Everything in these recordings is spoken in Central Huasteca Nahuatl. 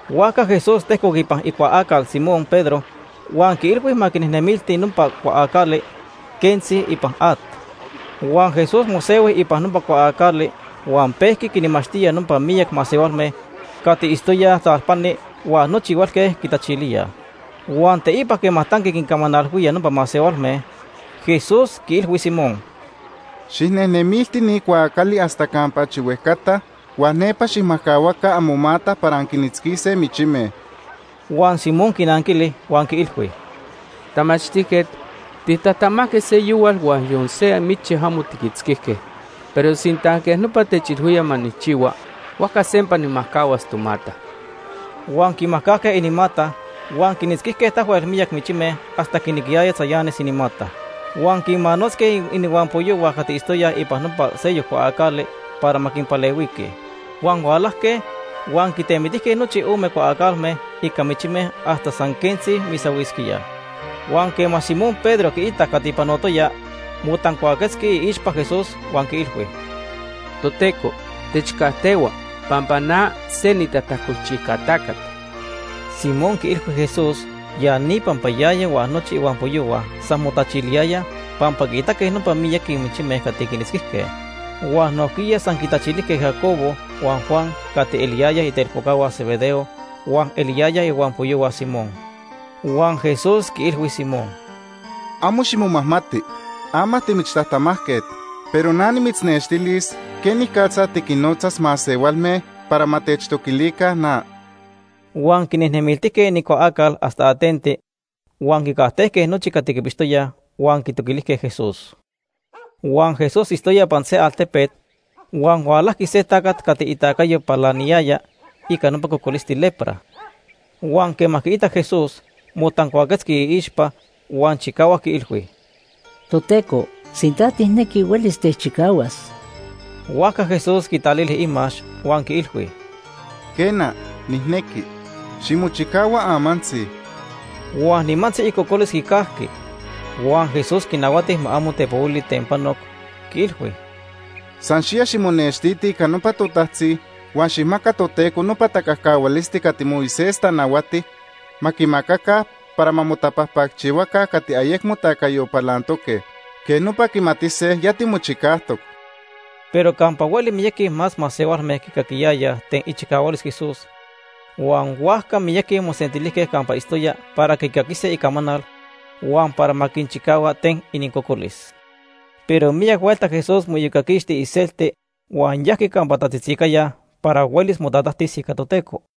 Huajca Jesús tejcoc ipan icuaacal Simón Pedro huan quiilhui ma quinejnemilti nopa cuaacali quentzi ipan at. Huan Jesús mosehui ipan nopa cuaacali huan pejqui quinmachtía nopa miyac masehualme cati itztoyaj talpani huan nochi huelque quitachilíaj. Huan teipa quema tanqui quincamanalhuía nopa masehualme, Jesús quiilhui Simón: ―Xijnejnemilti ni cuaacali hasta campa achi huejcata huan nepa xijmajcahuaca amomata para anquinitzquise michime. Huan Simón quinanquili huan quiilhui: ―Tamachtijquet, titajtamajque seyohual huan yon se michi amo tiquitzquijque. Pero sinta quej nopa techilhuía ma nijchihua, huajca sempa nijmajcahuas tomata. Huan quimajcajque inimata, huan quinitzquijque tahuel miyaqui michime hasta quinequiyaya tzayanis inimata. Huan quinmanotzque inihuampoyohua cati itztoyaj ipan nopa seyoc cuaacali para ma quinpalehuiquij. Huan hualajque huan quitemitijque nochi ome cuaacalme ica michime hasta san quentzi misahuisquíaj. Huan quema Simón Pedro quiitac cati panotoya, motancuaquetzqui iixpa Jesús huan quiilhui: ―Toteco, techcajtehua pampa na se nitajtacolchijca tacat. Simón quiilhui Jesús ya ni pampa yaya huan nochi ihuampoyohua san motachiliyayaj pampa quiitaque nopa miyaqui michime cati quinitzquijque. Huan nojquiya san quitachilijque Jacobo huan Juan cati eliyaya itelpocahua Zebedeo huan eliyayaj ihuampoyohua Simón. Huan Jesús quiilhui Simón: ―Amo ximomajmati. Ama timichtajtamajquet, pero na nimitznextilis quenicatza tiquinnotzas masehualme para ma techtoquilica na. Huan quinejnemiltijque inincuaacal hasta atenti, huan quicajtejque nochi cati quipixtoyaj huan quitoquilijque Jesús. Huan Jesús itztoya ipan se altepet, huan hualajqui se tacat cati itacayo palaniyaya ica nopa cocolisti lepra. Huan quema quiitac Jesús, motancuaquetzqui iixpa huan chicahuac quiilhui: ―Toteco, sinta tijnequi, huelis techchicahuas. Huajca Jesús quitalili imax huan quiilhui: ―Quena, nijnequi. Ximochicahua amantzi. Huan nimantzi icocolis quicajqui. Huan Jesús quinahuati ma amo tepohuili ten panoc, quiilhui: ―San xiya ximonextiti ica nopa totajtzi huan xijmaca Toteco nopa tacajcahualisti cati Moisés tanahuati ma quimacaca para ma motapajpacchihuaca cati ayecmo tacayo palantoque. Quej nopa quimatise ya timochicajtoc. Pero campa hueli miyaqui más masehualme quicaquiyayaj ten ichicahualis Jesús huan huajca miyaqui mosentilijque campa itztoya para quicaquise icamanal huan para ma quinchicahua ten inincocolis. Pero miyac huelta Jesús moiyocaquixti iselti huan yajqui campa tatzitzicaya para huelis motatajtis ica Toteco.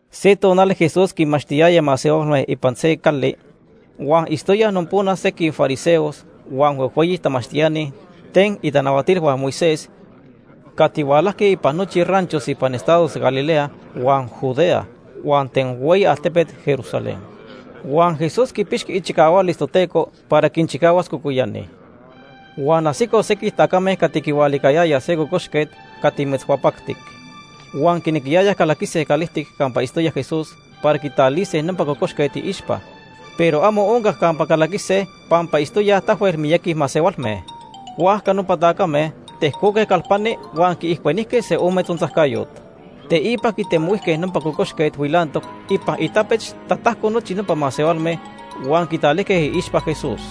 Se tonali Jesús quinmachtiyaya masehualme ipan se cali, huan itztoyaj nopona sequij fariseos huan huejhueyi tamachtiani ten itanahuatilhua Moisés cati hualajque ipan nochi ranchos ipan estados Galilea huan Judea, huan ten hueyi altepet Jerusalén. Huan Jesús quipixqui ichicahualis Toteco para quinchicahuas cocoyani. Huan ajsicoj sequij tacame cati quihualicayayaj se cocoxquet cati metzhuapactic. Huan quinequiyayaj calaquise calijtic campa itztoya Jesús para quitalise nopa cocoxquet iixpa, pero amo oncac campa calaquise pampa itztoyaj tahuel miyaqui masehualme. Huajca nopa tacame tejcoque calpani huan quiijcuenijque se ome tzontzajcayot. Teipa quitemohuijque nopa cocoxquet huilantoc ipan itapech tatajco nochi nopa masehualme huan quitalijque iixpa Jesús.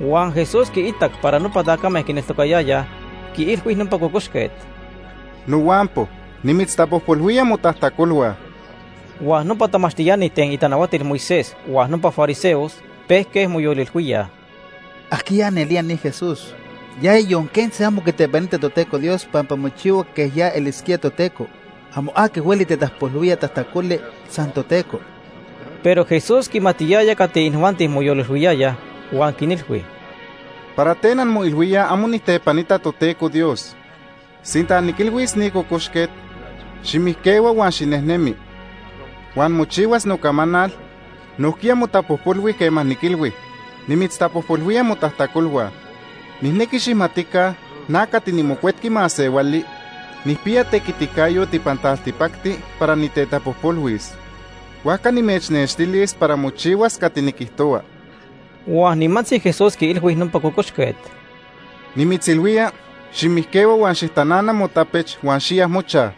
Huan Jesús quiitac para nopa tacame quineltocayayaj, quiilhui nopa cocoxquet: ―Nohuampo, nimitztapojpolhuía motajtacolhua. Huan nopa tamachtiani ten itanahuatil Moisés huan nopa fariseos pejque moyolilhuíaj: “¿Ajquiya nelía ni Jesús? Yaya yon quentzi amo quitepanita Toteco Dios pampa mochihua quej ya elisquía Toteco. Amo aqui hueli tetapojpolhuía tajtacoli, san Toteco.” Pero Jesús quimatiyaya cati inijuanti moyolilhuiyayaj huan quinilhui: ―¿Para ten anmoilhuíaj amo nijtepanita Toteco Dios? Sinta niquilhuis ni cocoxquet: ‘Ximijquehua huan xinejnemi’ huan mochihuas nocamanal, nojquiya motapojpolhui quema niquilhui: ‘Nimitztapojpolhuía motajtacolhua.’ Nijnequi xijmatica na cati niMocuetqui Masehuali nijpiya tequiticayot ipan taltipacti para nitetapojpolhuis, huajca nimechnextilis para mochihuas cati niquijtohua. Huan nimantzi Jesús quiilhui nopa cocoxquet: ―Nimitzilhuía, ximijquehua huan xijtanana motapech huan xiya mochaj.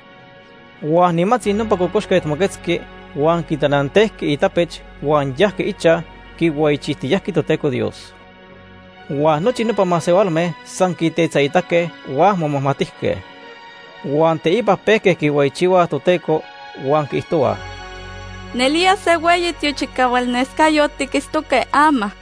Huan nimantzi nopa cocoxquet moquetzqui huan quitanantejqui itapech huan yajqui ichaj, quihueyichijtiyajqui Toteco Dios. Huan nochi nopa masehualme san quitetzaitaque huan momajmatijque. Huan teipa pejque quihueyichihuaj Toteco huan quiijtohuaj: ―Nelía se hueyi tiochicahualnescayot tiquitztoque ama.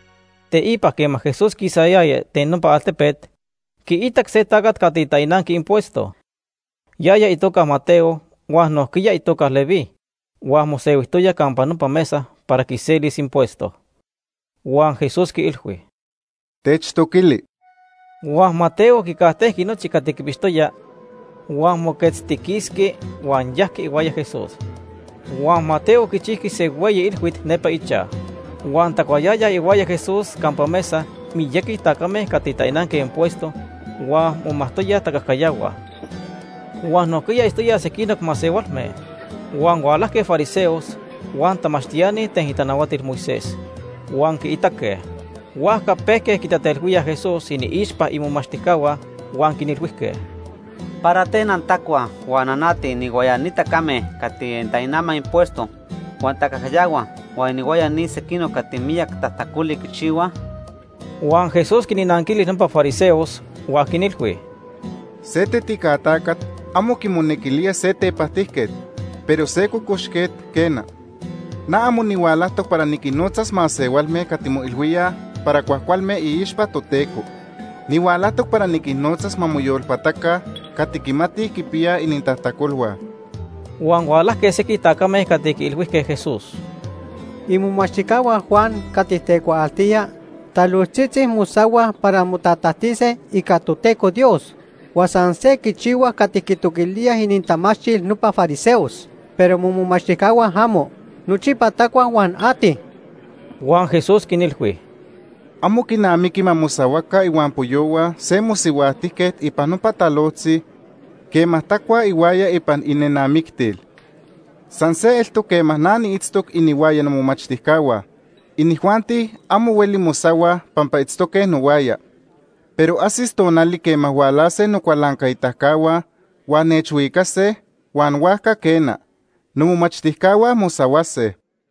Teipa quema Jesús quisayaya ten nopa altepet, quiitac se tacat cati tainanqui impuesto. Yaya itoca Mateo huan nojquiya itoca Leví, huan mosehuijtoya campa nopa mesa para quiselis impuesto. Huan Jesús quiilhui: ―Techtoquili. Huan Mateo quicajtejqui nochi cati quipixtoya, huan moquetztiquisqui huan yajqui ihuaya Jesús. Huan Mateo quichijqui se hueyi ilhuit nepa ichaj. Huan tacuayayaj ihuaya Jesús campa mesa miyac tacame cati tainanque impuesto huan momajtoyaj tacajcayahuaj, huan nojquiya itztoyaj sequinoc masehualme. Huan hualajque fariseos huan tamachtiani ten itanahuatilhua Moisés huan quiitaque. Huajca pejque quitatelhuíaj Jesús iniixpa imomachtijcahua huan quinilhuijque: ―¿Para ten antacuaj huan anatij inihuaya ni tacame cati tainamaj impuesto huan tacajcayahuaj huan inihuaya ni sequinoc cati miyac tajtacoli quichihuaj? Huan Jesús quinnanquili nopa fariseos huan quinilhui: ―Se tetica tacat amo quimonequilía se tepajtijquet, pero se cocoxquet, quena. Na amo nihualajtoc para niquinnotzas masehualme cati moilhuíaj para cuajcualme iixpa Toteco. Nihualajtoc para niquinnotzas ma moyolpataca cati quimatij quipiyaj inintajtacolhua. Huan hualajque sequij tacame cati quiilhuijque Jesús: ―Imomachtijcahua Juan cati tecuaaltía talojtzitzi mosahuaj para motatajtise ica Toteco Dios. Huan san se quichihuaj cati quitoquilíaj inintamachtil nopa fariseos, pero momomachtijcahua amo. Nochipa tacuaj huan atij. Huan Jesús quinilhui: ―Amo quinamiqui ma mosahuaca ihuampoyohua se mosihuajtijquet ipan nopa talojtzi quema tacuaj ihuaya ipan inenamictil. San se eltoc quema na niitztoc inihuaya nomomachtijcahua, inijuanti amo hueli mosahuaj pampa itztoque nohuaya. Pero ajsis tonali quema hualase nocualancaitacahua huan nechhuicase huan huajca quena, nomomachtijcahua mosahuase.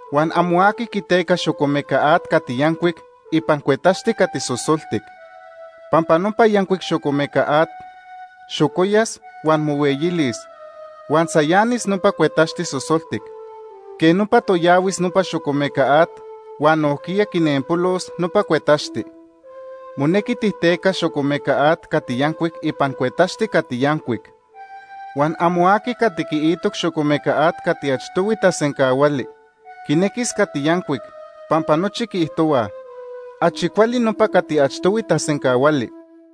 Huan amo aqui quiteca xocomeca at cati yancuic ipan cuetaxti cati sosoltic. Pampa nopa yancuic xocomeca at xocoyas, huan mohueyilis, huan tzayanis nopa cuetaxti sosoltic. Quej nopa toyahuis nopa xocomeca at huan nojquiya quinenpolos nopa cuetaxti. Monequi tijtecas xocomeca at cati yancuic ipan cuetaxti cati yancuic. Huan amo aqui cati quiitoc xocomeca at cati achtohui tasencahuali quinequis cati yancuic, pampa nochi quiijtohuaj: ‘Achi cuali nopa cati achtohui tasencahuali.’